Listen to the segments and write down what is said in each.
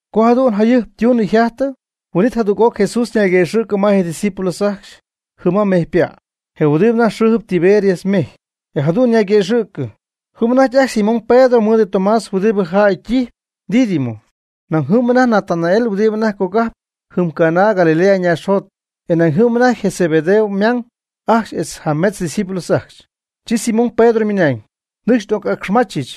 Co jadu'n jayɨjp ytunɨ yjajtɨ, huin'it jadüg'oc Jesús ñayguëxɨ̈cɨ ma je' ydiscípulos ajcxy jɨm ma mejypa', je huɨdibɨ anajty xɨɨjɨp Tiberias mejy. E jadu'n ñayguëxɨ̈cɨ: Jɨm anajty ajcxy Simón Pedro mɨɨd Tomás huɨdibɨ jäy ytijyp Dídimo. Nañ jɨm Natanael huɨdibɨ anajty cogajp jɨm Caná Galilea naaxjot. E nañ jɨm anajty je Zebedeo ymang ajcxy etz jametz discípulos ajcxy. Chi Simón Pedro ymɨnañ: ―Nɨcxy n'oc'acxmachɨch.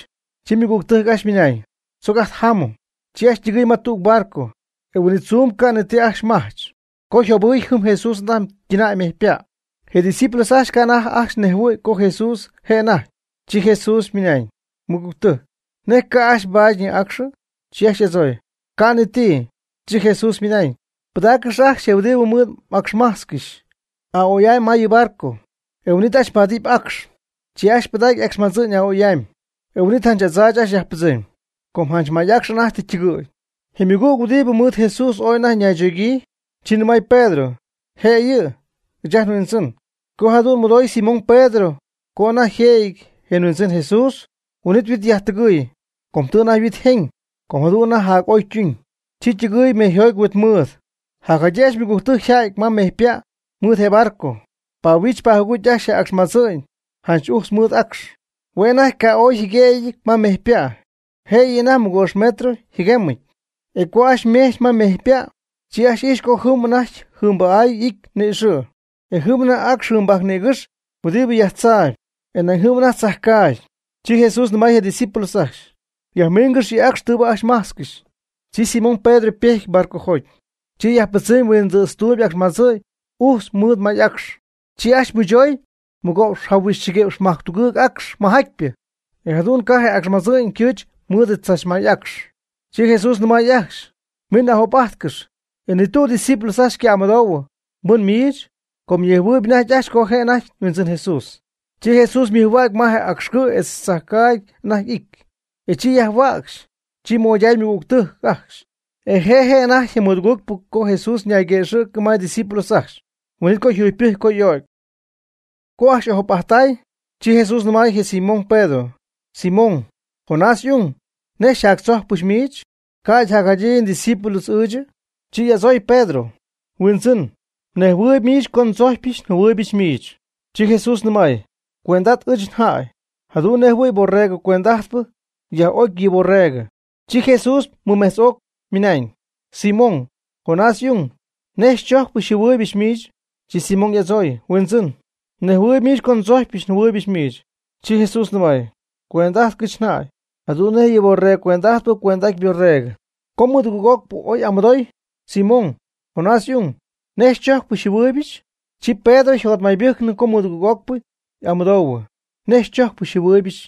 Chi ymɨgügtɨjc ajcxy ymɨnañ: ―Tzoc ajt jámɨm. Chi ajcxy ytɨgɨɨy ma tüg barco. E je huin'it tzuu ca' ni ti ajcxy majch. Co yjobɨɨy jɨm Jesús anajty ytɨnäy ma mejypa'. Je' ydiscípulos ajcxy ca' anajty ajcxy nejhuɨ̈y co Jesús je' anajty. Chi Jesús ymɨnañ: ―Mɨgügtɨjc, ¿nej ca' ajcxy mbaadyñɨ acxɨ? Chi ajcxy y'adzooy: ―Ca' ni ti. Chi Jesús ymɨnañ: ―Pɨdaaccɨx ajcxy je huɨdibɨ mɨɨd m'acxmajtzcɨxy aa'oy'amy ma yɨ barco, e huin'it ajcxy mbaadɨpy acx. Chi ajcxy pɨdacy je acxmadzɨ'ñ aa'oy'amy, e huin'it janch adzaach ajcxy yajpɨdzɨmy, co janch may acx anajty tɨ ytɨgɨ̈y. Je ymɨgüg huɨdibɨ mɨɨd Jesús ooy anajty ñaychogyii, chi nɨmay Pedro: ―Je' yɨ', ɨɨch ajt nHuindzɨn. Co jadu'n mɨdooy Simón Pedro co anajty yjëjɨty je Huindzɨn Jesús, huin'it yhuit yajtɨgɨɨy. Com tɨ anajty yhuit jeñ, com jadu'n anajty jac'oy ytuñ. Chi ytɨgɨɨy mejyjoty huitmɨɨd. Jacjadyii ajcxy ymɨgügtɨjc yjädy ma mejypa' mɨɨd je barco, pahuich pajugucy ajcxy je y'acxmadzɨ'ñ janch ujtz mɨɨd acx. Hue' anajty ca' ooy yjɨguémyɨty ma mejypa', jëyɨ anajty mɨgo'px metro yjɨguemyɨty. E co ajcxy ymejch ma mejypa', chi ajcxy ijxy co jɨm anajty jɨɨmbajc y'ity ni'ixɨ', e jɨm anajty acx jɨɨmbajc nïgɨx huɨdibɨ yajtzaayb, e nañ jɨm anajty tzajcaagy. Chi Jesús nɨmay je' ydiscípulos ajcxy: ―Yajmiingɨx yɨ acx tɨɨbɨ ajcxy mmajtzcɨxy. Chi Simón Pedro ypejty barcojoty, chi yajpɨdzɨmy huindɨɨtztuum y'acxmadzɨ'ñ ujtz mɨɨd may'acx. Chi ajcxy mɨchoy mɨgo'px jahuixchɨgi'px majctugɨɨg acx mɨjatypɨ, e jadu'n ca' je acxmadzɨ'ñ ycɨɨch mɨɨd tzachmay'acx. Chi Jesús nɨmay ajcxy: ―Min ajop'ajtcɨx. E ni tüg ydiscípulos ajcxy ca' y'amɨdoohuɨ: ―¿Pɨn miich? Com ñejhuɨɨyb anajty ajcxy co je' anajty Huindzɨn Jesús. Chi Jesús ymɨjhuägy ma je acx cɨ' etz tzajcaagy anajty y'ity, e chi yajhuäcxy, chi moyday ymɨgügtɨjc ajcxy. E je' je' anajty je mɨdugɨɨg'ocpɨ co Jesús ñayguëxɨ̈cɨ ma je' ydiscípulos ajcxy, huin'it co yjugypɨjcy co y'o'cy. Co ajcxy y'ajop'ajttay, chi Jesús nɨmay je Simón Pedro: ―Simón, Jonás y'ung, ¿nej xyjactzojcpɨch miich, ca'ydɨ jada jacjadyii ndiscípulo'ɨchɨ? Chi y'adzooy Pedro: ―Huindzɨn mnejhuɨɨyb miich co ndzojcypɨch njɨhuɨɨybɨch miich. Chi Jesús nɨmay: ―Cuend'at ɨɨch njäy, jadu'n nej jɨhuɨ̈y borregɨ cuend'ajtpɨ yaj'ocy yɨ' yborregɨ. Chi Jesús mɨmejtz'oc ymɨnañ: ―Simón, Jonás y'ung, ¿nej xychojcpɨch xyjɨhuɨɨybɨch miich? Chi Simón y'adzooy: ―Huindzɨn, mnejhuɨɨyb miich co ndzojcypɨch njɨhuɨɨybɨch miich. Chi Jesús nɨmay: ―Cuend'ajtɨgɨch njäy, jadu'n nej yɨ borregɨ cuend'ajtpɨ cuend'aty yborregɨ. Co mɨdugɨɨg'ocpɨ oy y'amɨdooy: ―Simón, Jonás y'ung, ¿nej xychojcpɨch xyjɨhuɨɨybɨch? Chi Pedro yjotmaybɨjcnɨ co mɨdugɨɨg'ocpɨ y'amɨdoohuɨ: “¿Nej xychojcpɨch xyjɨhuɨɨybɨch?”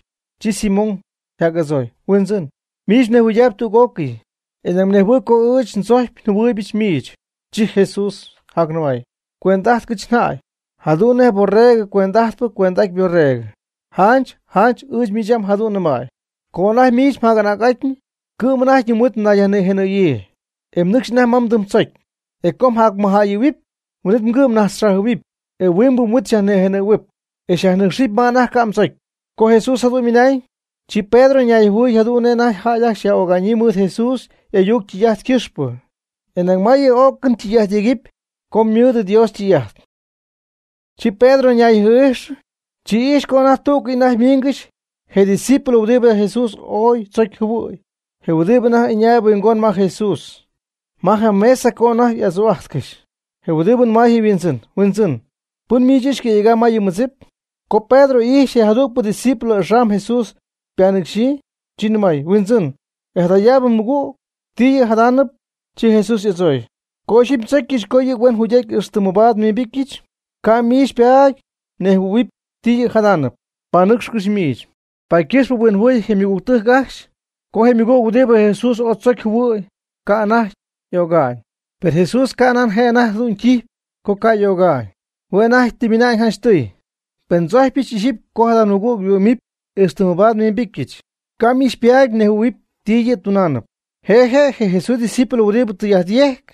Chi Simón yjac'adzooy: ―Huindzɨn, miich mnejhuɨydaayb tüg'ócɨy, e nañ mnejhuɨɨyb co ɨɨch ndzojcyp njɨhuɨɨybɨch miich. Chi Jesús jacnɨmay: ―Cuend'ájtɨgɨch njäy, jadu'n nej borregɨ cuend'ajtpɨ cuend'aty yborregɨ. Janch janch ɨɨch miich yam jadu'n nɨmäy: “Co anajty miich mjac'anägnɨty, cɨ'm anajty mhuit nayyajnïjenɨ̈yii, e mnɨcxp anajty ma mdɨmdzocy. E co mjacmɨjjäyɨ̈huɨpy, huin'it mgɨ' mnajtzxajɨ̈huɨpy, e huingbɨ mhuit xyajnïjenɨ̈huɨpy, e xyajnɨcxyɨpy ma anajty ca' mdzocy.” Co Jesús jadu'n ymɨnañ, chi Pedro yajhuinjɨhuɨɨy jadu'n nej anajty jäy ajcxy yaj'öga'ñyii mɨɨd Jesús y'ayuc ytɨy'ajt ycɨxpɨ, e nañ ma yɨ y'o'cɨn tɨy'ajt yegɨpy co ymɨɨd Dios ytɨy'ajt. Chi Pedro ñayjɨɨ'ijxɨ, chi ijxy co anajty tú'cɨy anajty ymiingɨxy je' ydiscípulo huɨdibɨ anajty Jesús ooy tzocy jɨhuɨ̈y je huɨdibɨ anajty ɨñaayb huingon ma Jesús ma je mesa co anajty y'adzuu'ajtcɨxy. Je huɨdibɨ nɨmay je' yHuindzɨn: ―Huindzɨn, ¿pɨn miich yɨ' xycɨ̈yegam ma yɨ mmɨdzip? Co Pedro ijxy je jadügpɨ discípulo axam Jesús ypanɨcxyii, chi ymɨnañ: ―Huindzɨn, e jadayaabɨ mɨgüg, ¿ti yɨ' jadaanɨp? Chi Jesús y'adzooy: ―Co ixyipy ndzocyɨch co yɨ' huen jugy'aty ixtɨ mabaad nhuimbityɨch, ca' miich xypaady mnejhuɨ̈huɨpy ti yɨ' jadam. Panɨcxcɨch miich. Paady ycɨxp huinjɨhuɨy je ymɨgügtɨjc ajcxy co je ymɨgüg huɨdibɨ Jesús ooy tzocy jɨhuɨ̈y ca' anajty y'öga'ñ. Per Jesús canan je' anajty jadu'n ytijyp co ca' y'öga'ñ. Hue' anajty tɨ ymɨna'ñ janchtɨy: ―Pen ndzojcypɨch ixyipy co jada mɨgüg yhuɨ'mɨpy ixtɨ mabaad nhuimbityɨch, ca' miich xypaady mnejhuɨ̈huɨpy ti yɨ' ytunamy. Je' je' je Jesús ydiscípulo huɨdibɨ tɨy'ajt yejcp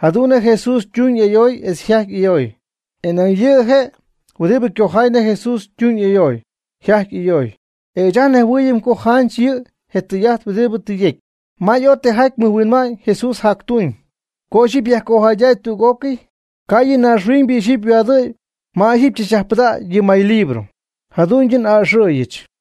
jadu'n nej Jesús ytuñ y'ayoy etz yjajty y'ayoy, e nañ yɨ' je' huɨdibɨ cojay nej Jesús ytuñ y'ayoy, yjajty y'ayoy. E ɨɨch ajt nejhuɨɨyɨm co janch yɨ' je tɨy'ajt huɨdibɨ tɨ yecy. May ooy tijaty mɨj huinma'ñ Jesús jactuñ. Co ixyipy yajcojaydäy tüg'ócɨy, ca' yɨ naaxhuiñybɨ ixyipy yhuaadɨ̈y mɨɨd maylibro tzachpɨdägɨpy. Jadu'n n'aa'ɨxɨ̈yɨch.